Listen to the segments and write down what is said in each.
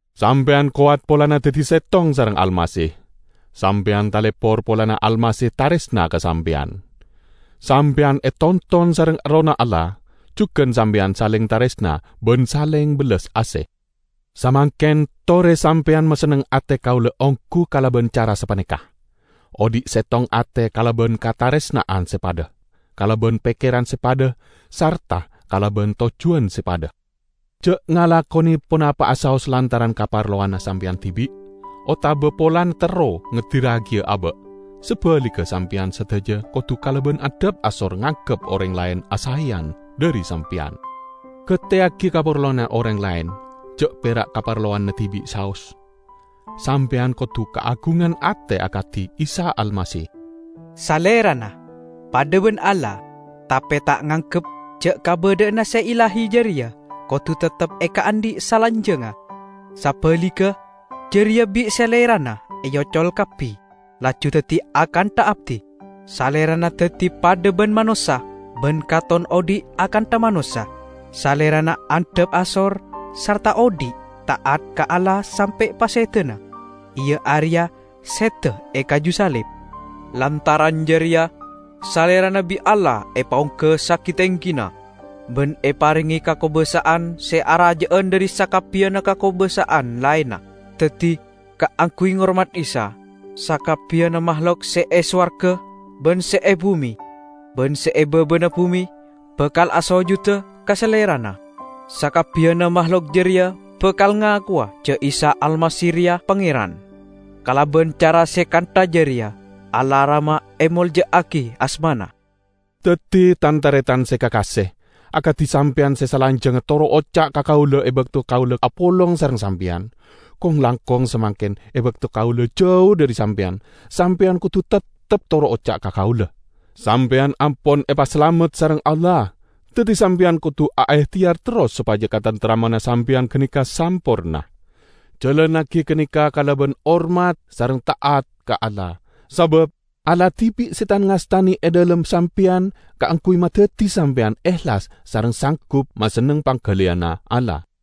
Sampeyan kowat polana daddi settong sareng Almasih. Sampeyan talepor polana Almasih taresna ka sampeyan! Sampeyan etonton sareng Errohna Allah, jugan sampeyan saleng taresna ban saleng bellas ase. Samangken, tore sampeyan masenneng ate kaula onggu kalaban cara sapaneka: Odhi' settong ate kalaban kataresna'an se padha, kalaban pekkeran se padha sarta kalaban tojjuwan se padha. Ja' ngalakone ponapa'a saos lantaran kaparlowanna sampeyan dibi', otaba polana terro ngedirragiya aba'. Sabaligga sampeyan sadaja kodu kalaban andhap asor nganggep oreng laen asaeyan dhari sampeyan. Gateyagi kaparlowanna oreng laen, ja' pera' kaparlowanna dibi' saos. Sampeyan kodu kaagungan ate akadi Isa Almasih: Salerana padha ban Allah tape ta' nganggep ja' kabadha'anna se illahi jareya kodu teptep ekaandhi' salanjangnga. Sabaligga, jareya bi' Salerana eocol kabbi, laju daddi akantha abdi. Salerana daddi padha ban manossa ban katon odhi' akantha manossa. Salerana andhap asor sarta odhi' ta'at ka Allah sampe' pasedana -- iya areya seda e kaju salib. Lantaran jareya Salerana bi' Allah epaongga sagi-tenggina, ban eparenge kakobasa'an se araja'an dhari sakabbiyanna kakobasa'an laenna. Daddi kaangguy ngormat Isa, sakabbiyanna mahlok se e sowarga ban se e bume ban se e babana bume, bakal asojuda ka Salerana. Sakabbiyanna mahlok jareya bakal ngakowa ja' Isa Almasih reya Pangeran; kalaban cara se kantha jareya Allah Rama emolja'agi asmana. Daddi, tan-taretan se kakase, akadi sampeyan se salanjangnga toro' oca' ka kaula e bakto kaula apolong sareng sampeyan, kong-langkong samangken e bakto kaula jau dhari sampeyan, sampeyan kodu teptep toro' oca' ka kaula. Sampeyan ampon epasalamet sareng Allah, daddi sampeyan kodu aehteyar terros sopaja kataremtemmanna sampeyan ganeka samporna. Jalannagi ganeka kalaban hormat sareng ta'at ka Allah, sabab Allah dibi' se tan-ngastane e dhalem sampeyan kaangguy madaddi sampeyan ehlas sareng sanggup masenneng panggaliyanna Allah.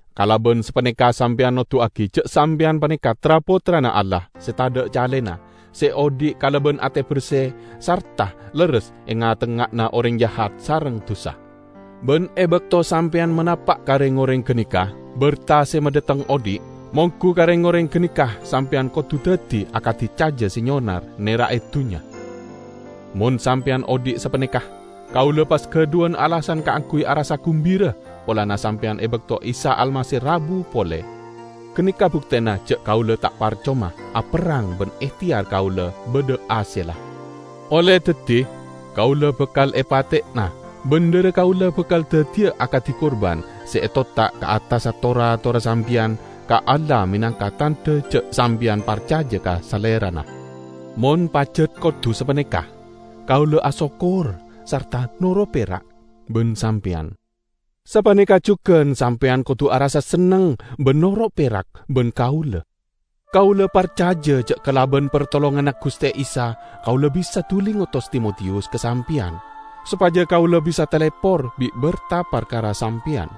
Kalaban sapaneka sampeyan noduwagi ja' sampeyan paneka tra-pottrana Allah se tadha' calena, se odhi' kalaban ate berse sarta lerres e nga'-tengnga'anna oreng jahat sareng dusa. Ban e bakto sampeyan manapa' ka reng-oreng ganeka berta se madhateng odhi', monggu ka reng-oreng ganeka sampeyan kodu daddi akadi caja se nyonar nera'e dunnya. Mon sampeyan odhi' sapaneka, kaula pas gadhuwan alasan kaangguy arassa gumbira polana sampeyan e bakto Isa Almasih rabu pole. Ganeka buktena ja' kaula ta' parcoma aperrang ban ehteyar kaula badha hasella. Olle daddi kaula bakal epateyana ban dhara kaula bakal daddiya akadi kurban se etotta' ka attassa tor-atorra sampeyan ka Allah menangka tandha ja' sampeyan parcaja ka Salerana. Mon pajat kodu sapaneka, kaula asokkor sarta noro' perak ban sampeyan. Sapaneka jugan sampeyan kodu arassa senneng ban noro' perak ban kaula. Kaula parcaja ja' kalaban partolonganna Guste Isa kaula bisa duli ngotos Timotiyus ka sampeyan, sopaja kaula bisa talepor bi' berta parkara sampeyan.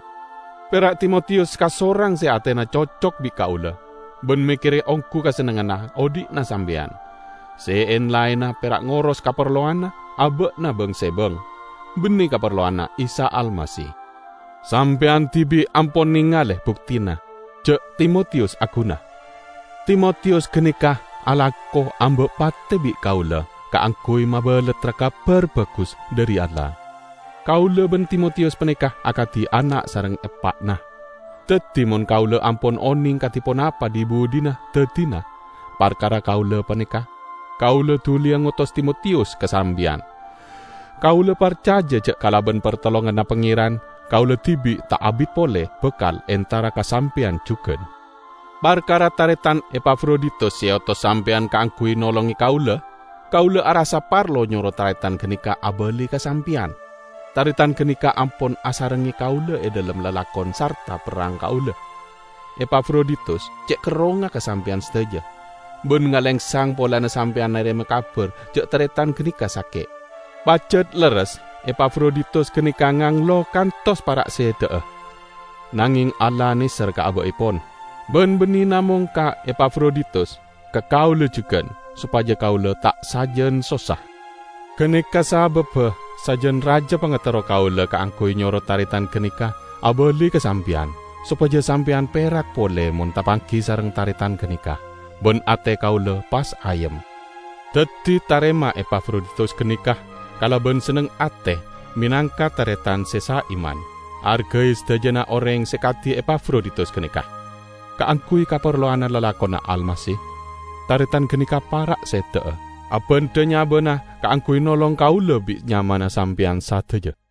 Pera' Timotiyus kasorang se atena cocok bi' kaula, ban mekkere onggu kasennengnganna odhi'na sampeyan. Se en-laenna pera' ngoros kaparlowanna aba'na bang-sebang, banne kaparlowanna Isa Almasih. Sampeyan dibi' ampon nengale buktena ja' Timotiyus aguna. Timotiyus ganeka alako amba' pate bi' kaula kaangguy mabalattra Kabar Bagus dhari Allah. Kaula ban Timotiyus paneka akadi ana' sareng eppa'na. Daddi mon kaula ampon oneng kadi ponapa dhi-budhina daddina parkara kaula paneka, kaula duliya ngotos Timotiyus ka sampeyan. Kaula parcaja ja' kalaban partolonganna Pangeran, kaula dibi' ta' abit pole bakal entara ka sampeyan jugan. Parkara taretan Epafroditus se eotos sampeyan kaangguy nolonge kaula, kaula arassa parlo nyoro taretan ganeka abali ka sampeyan. Taretan ganeka ampon asarengnge kaula e dhalem lalakon sarta perrang kaula. Epafroditus ce' kerrongnga ka sampeyan sadaja, ban ngalengsang polana sampeyan narema kabar ja' taretan ganeka sake'. Pajat lerres Epafroditus ganeka nganglo kantos para' seda'a. Nangeng Allah neser ka aba'epon; ban banne namong ka Epafroditus, ka kaula jugan, sopaja kaula ta' sajan sossa. Ganeka sababba sajan raja pangaterro kaula kaangguy nyoro taretan ganeka abali ka sampeyan, sopaja sampeyan perak pole mon tapanggi sareng taretan ganeka, ban ate kaula pas ayem. Daddi tarema Epafroditus ganeka kalaban senneng ate menangka taretan se saiman. Argai sadajana oreng se kadi Epafroditus ganeka. Kaangguy kaparlowanna lalakonna Almasih, taretan ganeka para' seda'a; abandha nyabana kaangguy nolong kaula bit nyamana sampeyan sadaja.